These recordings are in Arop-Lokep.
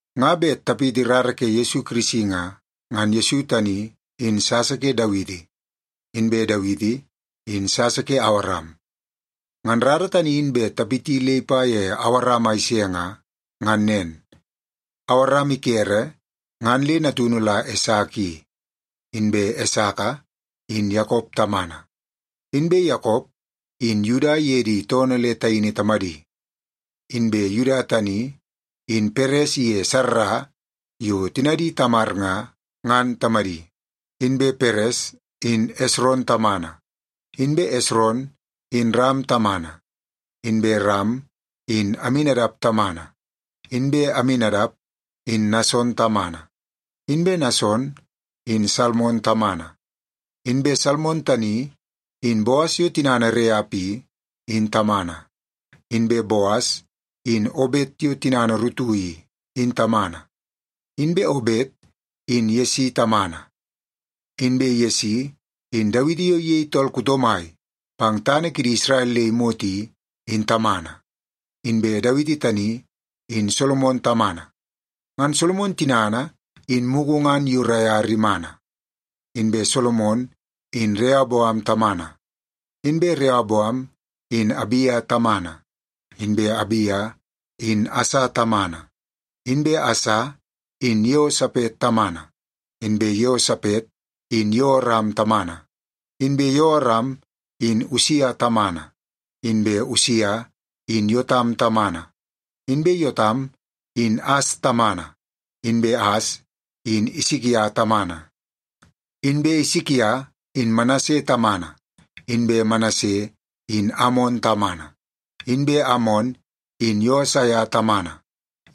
Nga bet tapiti rara ke Yesu Kirisi nga, ngan Yesu tani, in sasa ke Dawiti, inbe Dawiti in sasa ke Awaram. Ngan rara tani in bet tapiti le ipa ye Awaram a ise nga, ngan nen. Awaram ikere ngan le natunu la Esaka i. Inbe Esaka in Yakop tamana. Inbe Yakop in Yuda iye di toonoo le taini tamadi. Inbe Yuda tani in Peres iye Sarra yo tinadi Tamar nga, ngan tamadi. Inbe Peres in Esron tamana. Inbe Esron in Ram tamana. Inbe Ram in Aminadap tamana. Inbe Aminadap in Nason tamana. Inbe Nason in Salmon tamana. Inbe Salmon tani, in Boas yo tinana Reap i, in tamana. Inbe Boas in Obet yo tinana Rutu i, in tamana. Inbe Obet in Yesi tamana. Inbe Yesi in Dawiti yo iyei tool kuto mai pang tana kidi Isrel le imot i, in tamana. Inbe Dawiti tani in Solomon tamana. Ngan Solomon tinana in mugu ngan Uria rimana. Inbe Solomon in Reoboam tamana. Inbe Reoboam in Abia tamana. Inbe Abia in Asa tamana. Inbe Asa in Yeosapet tamana. Inbe Yeosapet in Yeoram tamana. Inbe Yeoram in Usia tamana. Inbe Usia in Yotam tamana. Inbe Yotam in As tamana. Inbe As in Isikia tamana. Inbe Isikia in Manase tamana. Inbe Manase in Amon tamana. Inbe Amon in Yosaia tamana.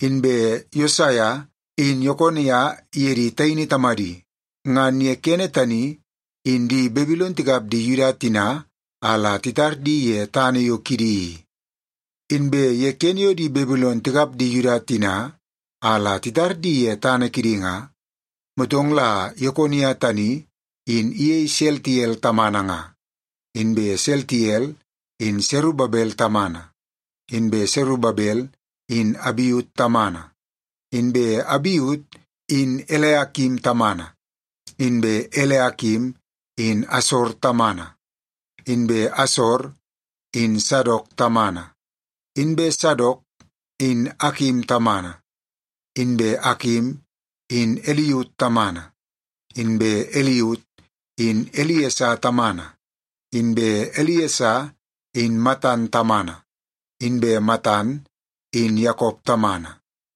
Inbe Yosaia in Yekonia iye di taini tamadi. Ngan ye kene tani in di Babilon tikap di Yuda tina a la titar di ye tana yo kidi i. Inbe ye kene yo di Babilon tikap di Yuda tina a la titar di ye tana kidi nga, motong la Yekonia tani in iyei Seltiel tamana nga. Inbe Seltiel in Serubabel tamana. Inbe Serubabel in Abiut tamana. Inbe Abiut in Eliakim tamana. Inbe Eliakim in Asor tamana. Inbe Asor in Sadok tamana. Inbe Sadok in Akim tamana. Inbe Akim in Iliut tamana. Inbe Iliut in Iliesa tamana. Inbe Iliesa in Matan tamana. Inbe Matan in Yakop tamana.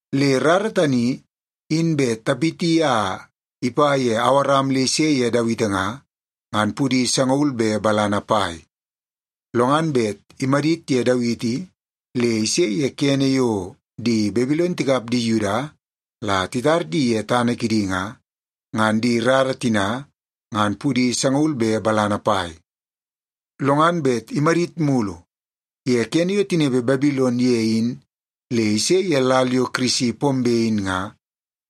Le rara tani in bet tapiti a ipa ye Awaram le ise ye Dawiti nga, ngan pudi sangaul be balana pai. Lo ngan bet imadit ye Dawiti le ise ye kene yo di Babilon tikap di Yuda la titar di ye tana kidi nga, ngan di rara tina ngan pudi sangaul be balana pai. Lo ngan bet imadit mulu ye kene yo tinepe Babilon ye in le ise ye lal yo Kirisi pombe in nga,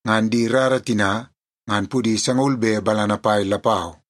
ngan di rara tina ngan pudi sangaul be balana pai lapau.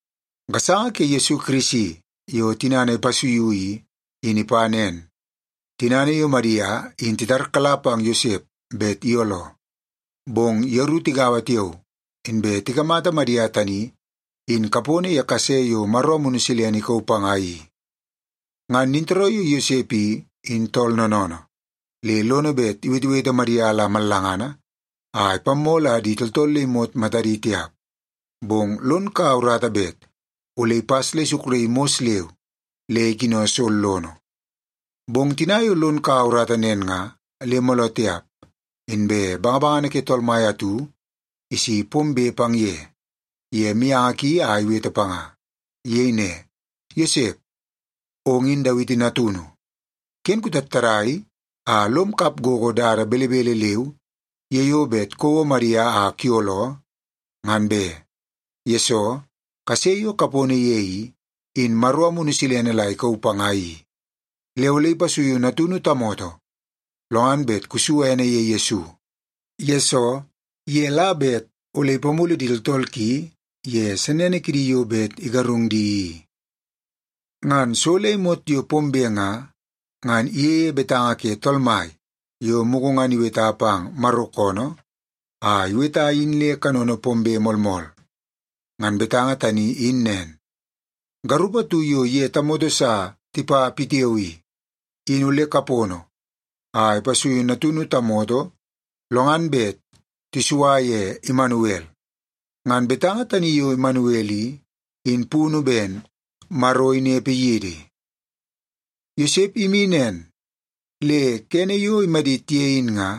Gasanga ke Yesu Kirisi yo tinana ipasuiu i, in ipa nen. Tinana yo Madia in titarkala pang Yosep bet iyooloo, bong yeru tigaua tiao, inbe tikamata Madia tani in kapono ye kase yo Maro Amunu Silene ikauu panga i. Ngan nintooroo yo Yosep i, in tool noonoonoo, le lono bet iwetewete Madia la mallangana a ipammoo la di tooltool le imot matadi tiap. Bong lon kaua urata bet ole ipas le isukraii mos leu le ikino sollono. Bong tina yo lon kaua urata nen nga, le mooloo tiap inbe bangabangana ke Tool Mai atu isi pombe pang ye, ye mianga ki a iwete panga. Iyei ne, “Yosep, ong in Dawiti natunu. Ken kutattadai a lom kap gogo dada belebele leu ye yo bet kouo Madia a kuyooloo, ngan be, yesoo kase yo kapono ye i, in Maro Amunu Silene la ikauu panga i. Le ole ipasuiu natunu tamoto, lo ngan bet kusu ene ye Yesu, yesoo ye la bet ole ipamulu di tooltool ki ye sennene kidi yo bet igarung di i.” Ngan so le imot yo pombe nga, ngan iyeie betanga ke Tool Mai yo mugu ngan iweta pang Maro koonoo a iweta in le kanono pombe moolmool. Ngan betanga tani in nen, “Garup atu yo iye tamoto sa tipa pitiao i, in ole kapono a ipasuiu natunu tamoto, lo ngan bet tisua ye Imanuel.” Ngan betanga tani yo Imanuel i, in punu ben, “Maro inepe yidi.” Yosep imi nen, le kene yo imadit ye in nga,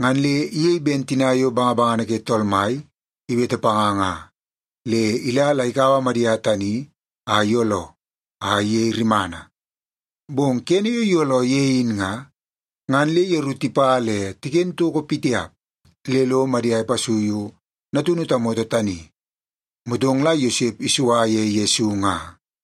ngan le iyei ben tina yo bangabangana ke Tool Mai iwete panga nga. Le ila la ikaua Madia tani a iyooloo, a iyei rimana. Bong kene yo iyooloo ye in nga, ngan le yeru tipa le tiken toko pitiap le lo Madia ipasuiu natunu tamoto tani. Motong la Yosep isua ye Yesu nga.